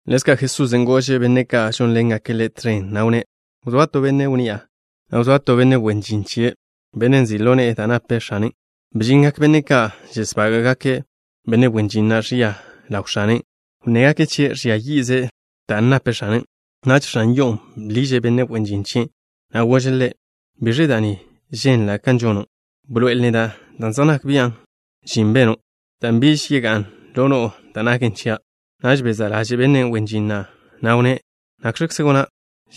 Ḻezka' Jesusen' gože' benne' ka' žónḻengake' Ḻe' tẕen, na' wnné': —Wzóa to benne' wnni'a, na' wzóa to benne' wen žin chie', benne' nzi' ḻo ne'e da' nape x̱ane'. Bžingak benne' ka' žesbága'gake' benne' wen žin na' ẕia ḻaw x̱ane'. Wnnégake' chie' ẕžia yi'ze' da' nape x̱anen'. Naž x̱an yo'on' bḻiže' benne' wen žin chien', na' gože' ḻe': “¿Biẕe da' ni ženla' kan žono'? Bḻoe'el neda' da' zej nak bian' žin beno', dan' biž yegá'n ḻo no'o da' naken chia'.” Naž bezá' ḻaže' benne' wen žin na', na'wnné': “¿Nakx̱kze gona'?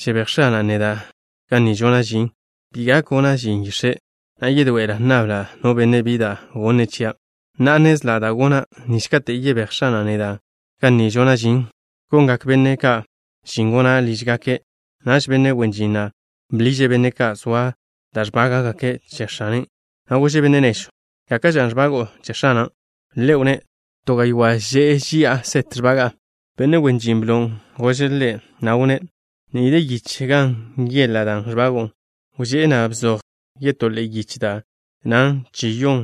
Žebéj x̱ana' neda' ga ni žona' žin. Bi gak gona' žin yix̱e', na' yedoe'ela' nnabla' no benne' bi da' gonnze' chia'. Na'a nnezla' da' gona' nich kate' yebéj x̱ana' neda' ga ni žona' žin, gonngak benne' ka' žin gona' lížgake'.” Naž benne' wen žin na' bḻiže' benne' ka' zoa da' ẕbága'gake' che x̱ane', na' gože' benne' nežw: “¿Gáka'ẕe ẕbago'o che x̱ana'?” Ḻe' wnné': “To gaywá' že'e ži'a set ẕbaga'a.” Benne' wen žin blon' gože' ḻe', na' wnné': “Ni de yich gan nyeḻa' dan' ẕbago'o. Wžé'e, na' bzoj yetó ḻe'e yich da' nnan chi-yon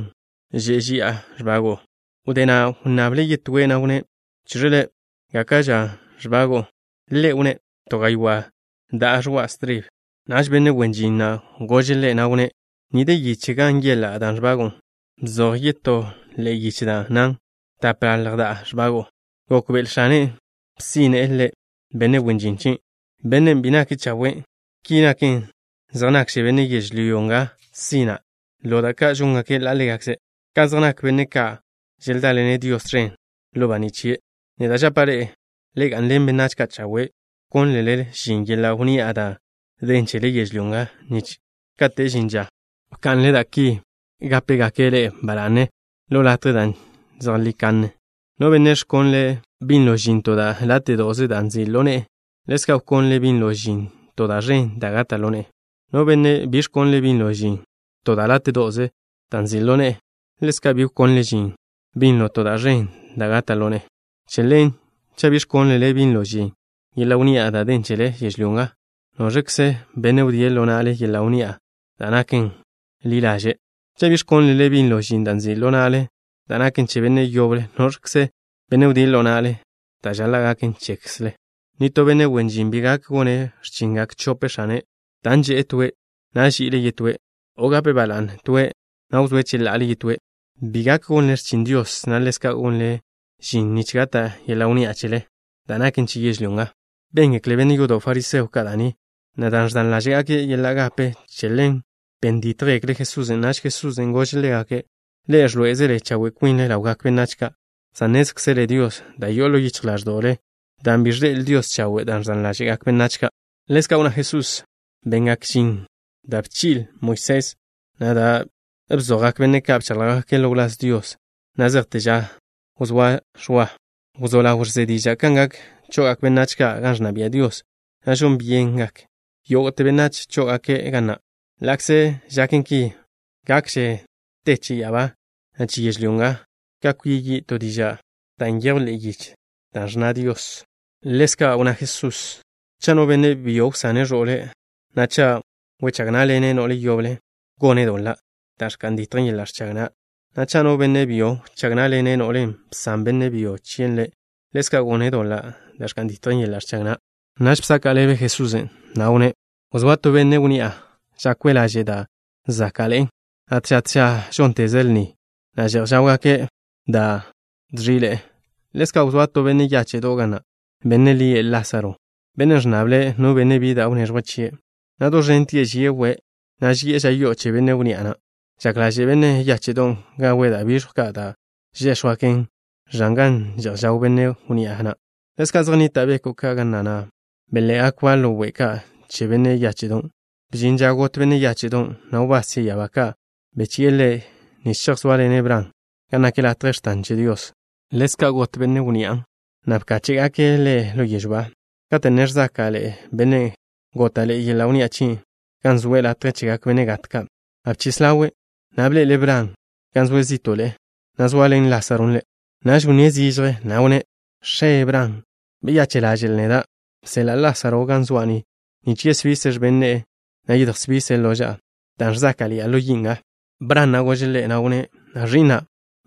že'e ži'a ẕbago'o.” Wdé na' wnnable' yetóe', na' wnné': “Cheẕe le', ¿gáka'ẕe ẕbago'o?” Ḻe' wnné': “To gaywá' da'a ẕoa' stribe.” Naž benne' wen žin na' gože' ḻe', na' wnné': “Ni de yich gan nyeḻa' dan' ẕbago'o. Bzoj yetó ḻe'e yich da' nnan tapḻalj da'a ẕbago'o.” Gokbe'el x̱ane' bsíne'le benne' wen žin chien', bennen' bi nake' chawe'. Ki naken, zej nakže benne' yežlyó nga sina' ḻo da' ka' žóngake' ḻa' ḻégakze', ka zej nak benne' ka' želdáḻene' Dios tẕen ḻo baní' chie'. ’Neda' žapa' ḻe'e: le ga'nḻen benách ka' chawe', wkónlele žin yeḻa' wnni'a da' den chele yežlyó nga, nich kate' žin ža wka'nle da' ki, gápegake' ḻe'e ba la'ne ḻo latjen' da' zejlí kanne. ’No benne' ẕkonle' binlo žin to da' láte'do'ze da' nzi' ḻo ne'e, ḻezka' wkonle' binlo žin to da' ẕen da' gata' ḻo ne'e. No benne' bi ẕkonle' binlo žin to da' láte'do'ze da' nzi' ḻo ne'e, ḻezka' bi wkonle' binlo žin to da' ẕen da' gata' ḻo ne'e. Che ḻen, cha' bi ẕkónlele binlo žin yeḻa' wnni'a da' den chele yežlyó nga, ¿noẕkze benne' wdíe' ḻo na'le yeḻa' wnni'a da' naken ḻi ḻaže'? Cha' bi ẕkónlele binlo žin da' nzi' ḻo na'le da' naken che benne' yoble, ¿noẕkze benne' wdíe' ḻo na'le da' žaḻa' gaken chekzle? ’Nitó benne' wen žin bi gak gone' x̱chingak chope x̱ane', dan' že'e toen', na' ži'ile' yetóen', o gape' ba la'ne toen', na' wzóe' cheḻa'ale yetóen'. Bi gak gonle x̱chin Dios, na' ḻezka' gonle žin nich gata' yeḻa' wnni'a chele, da' naken che yežlyó nga. Béngekle benne' yodo' fariseo ka' da' ni, na' dan' ẕdan ḻáže'gake' yeḻa' gape, che ḻen ben dítjgekle' Jesusen'. Naž Jesusen' gože' ḻégake': —Ḻe'e ẕḻoé'ezele chawe' kwinle ḻawgak benách ka', san nnézkzele Dios da' yo'o ḻo yichj ḻáẕdo'le, dan' bi ẕḻe'el Dios chawe' da' ẕdan ḻáže'gak benách ka'. Ḻezka' wnná Jesusen': —Bengak žin da' bchi'le Moisés, na' da' bzojgak benne' ka' bcháḻjgake' ḻo wláz Dios, na' zejte ža wzóa Ẕwa. Naž katen' bḻa' Ẕwan', wzó ḻaw ẕze diža' kan gak cho'ogak benách ka' gan ẕnna bia' Dios, na' žon byengak yógo'te benách chó'ogake' ga na'. ’Ḻa'kze žaken ki, gakže te che ya'abá, na' che yežlyó nga ka kwia yi' to díža'ze da' nyejwn ḻe'e yich da' ẕnna Dios. Ḻezka' wnná Jesusen': —Cha' no benne' byo wsane' ẕo'le', na' cha' wechág ná'ḻene' no'le yoble, gone' doḻa' da' ẕka'n ditjen yeḻa' ẕchag na', na' cha' no benne' byo wchág ná'ḻene' no'len' bsan benne' byo chie' ḻe', ḻezka' gone' doḻa' da' ẕka'n ditjen yeḻa' ẕchag na'. Naž bzaka' ḻebe Jesusen', na' wnné': —Wzóa to benne' wnni'a. Žakwe' laže' da' záka'ḻe'en, na' tža tža žónteze' lni, na' že'j žáwgake' da' dẕi'ḻe'e. Ḻezka' wzóa to benne' yáche'do' ga na', benne' lie' Lásaro. Bennen' ẕnnable' no benne' bi da' wneẕjwe' chie', na' do ẕentie' žie' we', na' ži'e ža yo'o che benne' wnni'a na'. Žak ḻaže' benne' yáche'don' gawe' da' biẕjw ka' da' žéx̱jwgaken ẕan gan že'j žaw benne' wnni'a na'. Ḻezka' zej nnita' beko' ka' ga na', na' bel-ḻe'eba' ḻo we' ka' che benne' yáche'don'. Bžin ža got benne' yáche'don', na' wbás che ya'abá ka' belchi'e ḻe' nich chejzóaḻene' Bran gan nak latje x̱tan che Dios. Ḻezka' got benne' wnni'a na', na' bkáche'gake' ḻe' ḻo yežw ba. Kate' ne ẕzáka'ḻe'e bennen' góta'ḻe'e yeḻa' wnni'a chie', gan zoe' latje chegak benne' gat ka', na' bchis ḻawe', na' bḻe'ele' Bran, gan zoe' zí'to'le, na' zoaḻen Lásaron' ḻe'. Naž wnníe' zižje, na' wnné': “X̱e, Bran, beyache' ḻaže'l neda'. Bseḻa' Lásaro ga zoa' ni nich yesbise' x̱ben ne'e, na' yedjsbise' loža'a, dan' ẕzáka'ḻi'a ḻo yi' nga.” Bran na' gože' ḻe', na' wnné': “Ẕi'na',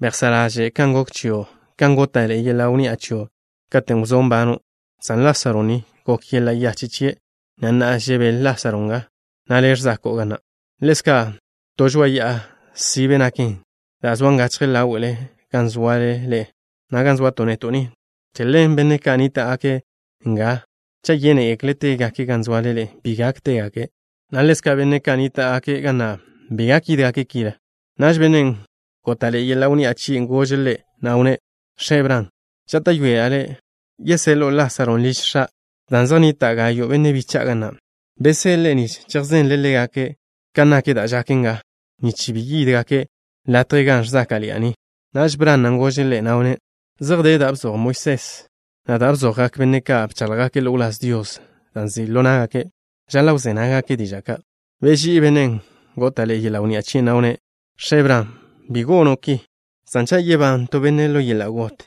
bejsá' ḻaže' kan gok chio', kan góta'ḻe'e yeḻa' wnni'a chio' katen' wzó' nbano', san Lásaro ni, gok yeḻa' yache' chie', na' na'a, žebél Lásaro nga, na' le' ẕzako'o ga na'. Ḻezka', to žoa'a ya'a sibe naken, dan' zoan gachje ḻáwe'le gan zoale ḻe'e, na' ga zoato' neto' ni. Che ḻen benne' ka' nníta'gake' nga, cha' yénegekle' tégake' gan zoale ḻe'e, bi gak tégake', na' ḻezka' benne' ka' nníta'gake' ga na' bi gak yídgake' kile.” Naž bennen' góta'ḻe'e yeḻa' wnni'a chie' gože' ḻe', na' wnné': “X̱e, Bran, žáta'yoela' le' yeseḻo'o Lásaron' liž x̱a', dan' zej nnita' gayo' benne' bicha'a ga na'. Beseḻe'e nich chejzenle' ḻégake' ka nak da' žaken nga, nich bi yídgake' latje ga ẕzáka'ḻi'a ni.” Naž Bran na' gože' ḻe', na' wnné': “Zej de da' bzoj Moisés, na' da' bzojgak benne' ka' bcháḻjgake' ḻo wláz Dios, da' nzi' ḻo ná'gake'. Žaḻa' wzé nággake' diža' ka'.” Beží'i bennen' góta'ḻe'e yeḻa' wnni'a chie', na' wnné': “X̱e, Bran, bi gonen ki, san cha' yebán to benne' ḻo yeḻa' got,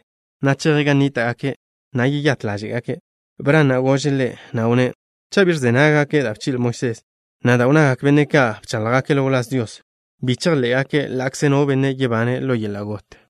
na' cheje' gan nníta'gake', na' yeyát ḻáže'gake'.” Bran na' gože' ḻe', na' wnné': “Cha' bi ẕze nággake' da' bchi'le Moisés, na' da' wnnagak benne' ka' bcháḻjgake' ḻo wláz Dios, bi chejḻé'gake' ḻa'kze no benne' yebane' ḻo yeḻa' got.”